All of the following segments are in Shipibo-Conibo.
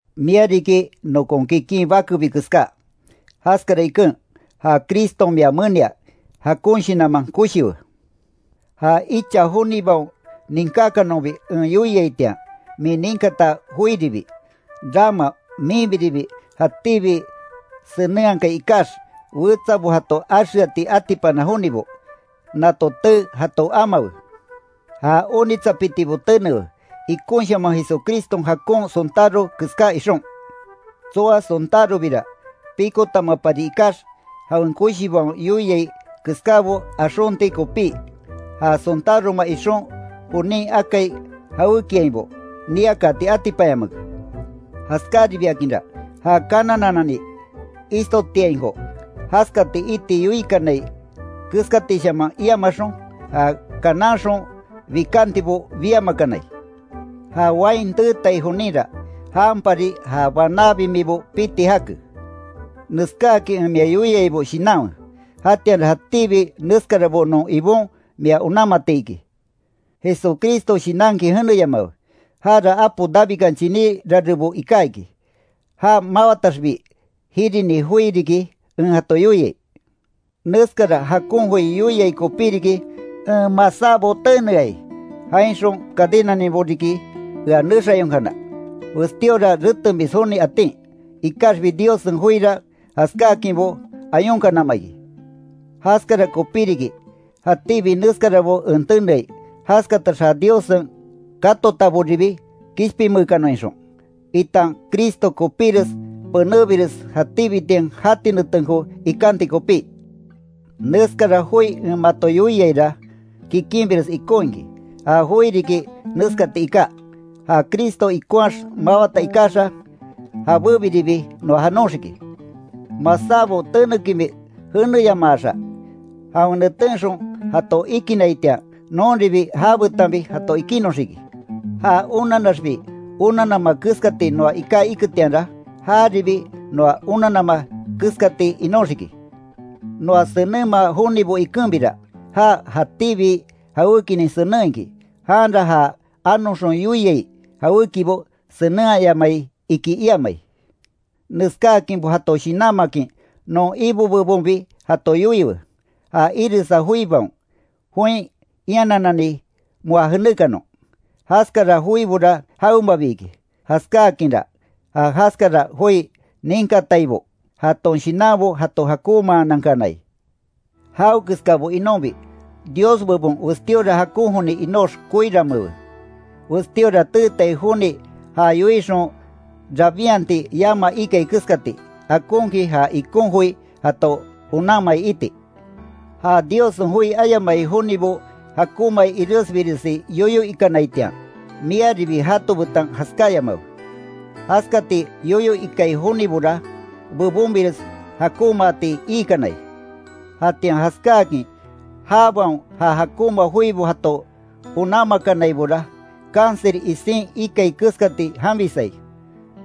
Mia riki nokon kikin bakebi keská, jaskara iken, ja Criston mia menia jakon shinanman koshiwe, Ja icha jonibaon ninkákanonbi en yoiaitian, min ninkata joiribi, rama minbiribi, jatíbi senenhakai ikax wetsabo jato axeati atipana jonibo, nato tee jato amawe. Ja onitsapitibo tenewe, ikonshaman Jesucriston jakon sontáro keská ixon. Tsoa sontárobira, pikotamapari ikax jawen koshibaon yoiai keskábo axonti kopí, ja sontároma ixon jonin akai jawékiainbo, niakaati atipanyamake. Jaskaribiakinra, ja kananananni ishtotiainko, jaskati iti yoikanai keskatishaman iamaxon, ja kananxon bikantibo biamakanai. Ja wain teeteai joninra, janpari ja banaa bimibo piti jake. Neskáakin en mia yoiaibo shinanwe, jatianra jatíbi neskarabo non Ibon mia onanmati iki. Jesucristo shinankin jeneyamawe, jara apo Davidkan chiní rarebo iká iki, já mawataxbi, jirini joi riki, en jato yoiai. Neskara jakon joi yoiai kopí riki, en masábo teneai, jainxon cadenaninbo riki, ea nexayonkana, westíora retemis joni atin. Ikaxbi Diossen joira jaskákinbo ayonkanama iki. Jaskara kopí riki, jatíbi neskarabo en teneai, jaskatax ja Diossen katotaboribi kishpinmeekanon ixon, itan Cristo kopíres penébires jatíbitian jati netenko ikanti kopí. Neskara joi en mato yoiaira, kikinbires ikon iki, ja joi riki neskati iká: Ja Cristo ikonhaax mawata ikaxa, jabébiribi noa janoxiki. Masábo tenekinbi jeneyamaaxa, jawen netenxon jato ikinnaitian, nonribi jabetanbi jato ikinnoxiki. Ja onannaxbi onannama keskati noa iká iketianra, jaribi noa onannama keskati inoxiki. Noa senenma jonibo ikenbira, já jatíbi jawékinin senen iki, janra, ja anoxon yoiai jawékibo senenhayamai, iki iamai. Neskáakinbo jato shinanmakin non Ibo bebonbi jato yoiwe, ja iresa joibaon, join ianananni moa jenékanon, jaskara joibora jawemabi iki, jaskáakinra, ja jaskara joi ninkataibo jaton shinanbo jato jakonmaanankanai. Jawekeskabo inonbi, Dios bebon westíora jakon joni inox koiramewe, westíora teetai joni ja yoixon rabinhati yama ikai keskati, akonkin ja ikon joi jato onanmai iti. Ja Diossen joi ayamai jonibo jakonmai iresbiresi yoyo ikanaitian, miaribi jato betan jaskáyamawe, jaskati yoyo ikai jonibora, bebonbires jakonmaati iikanai. Jatian jaskáakin jabaon ja jakonma joibo jato onanmakanaibora, cancer isin ikai keskati janbisai,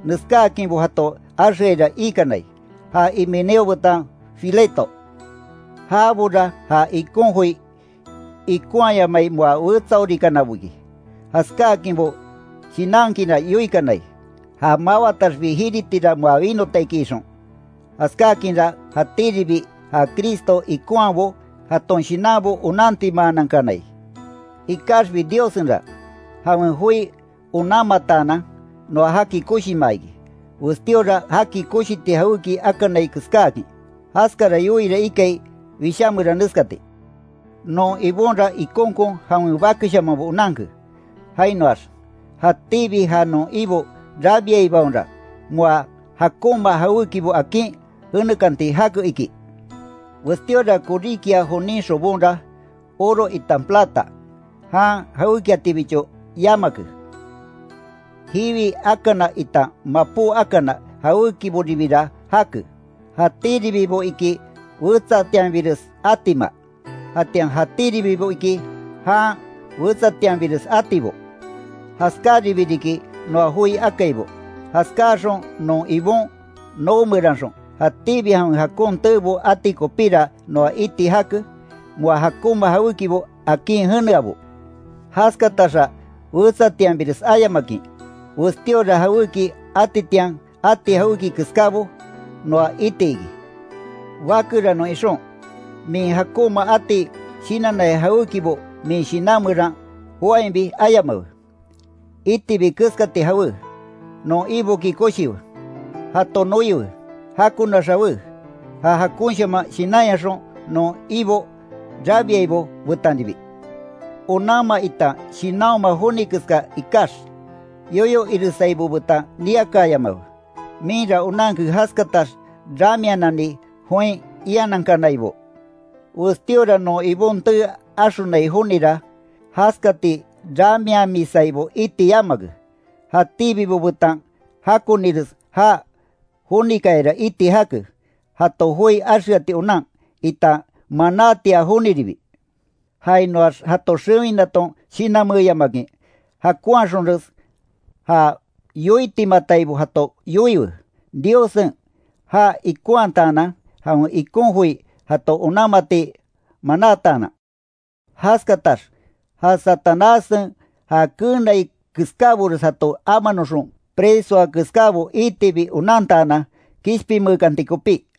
neskákinbo jato axeaira iikanai, ja Himeneo betan Fileto. Jabora ja ikon joi ikonhayamai moa wetsaorikanabo iki, jaskáakinbo shinankinra yoikanai, ja mawataxbi, jiritira moa winota iki ixon. Jaskákinra, jatíribi ja Cristo ikonhaabo jaton shinanbo onantimaanankanai. Ikaxbi Diossenra, jawen joi onanmataanan, noa jaki koshimaa iki, westíora jaki koshiti jawéki akanai keskáakin, jaskara yoiira ikai Wishá meran neskati: “Non Ibonra ikonkon jawen bakeshamanbo onanke”, jainoax “jatíbi ja non Ibo rabiaibaonra moa jakonma jawékibo akin jenekanti jake”, iki. Westíora koríkia jonin xobonra, oro itan plata, jan jawékiatibicho yamake, jiwi akana itan mapó akana jawékiboribira jake, jatíribibo iki wetsatianbires atima, jatian jatíribibo iki, jan wetsatianbires atibo. Jaskararibi riki, noa joi akaibo, jaskáxon non Ibon noo meranxon, jatíbi jawen jakon teebo ati kopíra noa iti jake, moa jakonma jawékibo akin jeneabo. Jaskataxa wetsatianbires ayamakin, westíora jawéki atitian ati jawéki keskábo, noa iti iki. Bakeranon ixon, min jakonma ati shinannai jawékibo min shinan meran joáinbi ayamawe. Itibi keskati jawe, non Iboki koshiwe, jato noiwe, jakonax jawe, ja jakonshaman shinanyaxon non Ibo rabiaibo betanribi. Onanma itan shinanhoma joni keská ikax, yoyo iresaibo betan niakaayamawe, minra onanke jaskatax ramianani join ianankanaibo. Westíora non Ibon tee axonai jonira, jaskati ramiamisaibo iti yamake, jatíbibo betan jakonires já jonikayara iti jake, jato joi axeati onan, itan manátia joniribi. Jainoax jato xewinaton shinanmeeyamakin, jakonhaxonres ja yoitimataibo jato yoiwe. Diossen já ikonhamataanan jawen ikon joi jato onanmati manátaanan. Jaskatax ja Satanássen ja keenai keskábores jato amanoxon presoa keskábo, iitibi onantaanan, kishpinmeekanti kopí.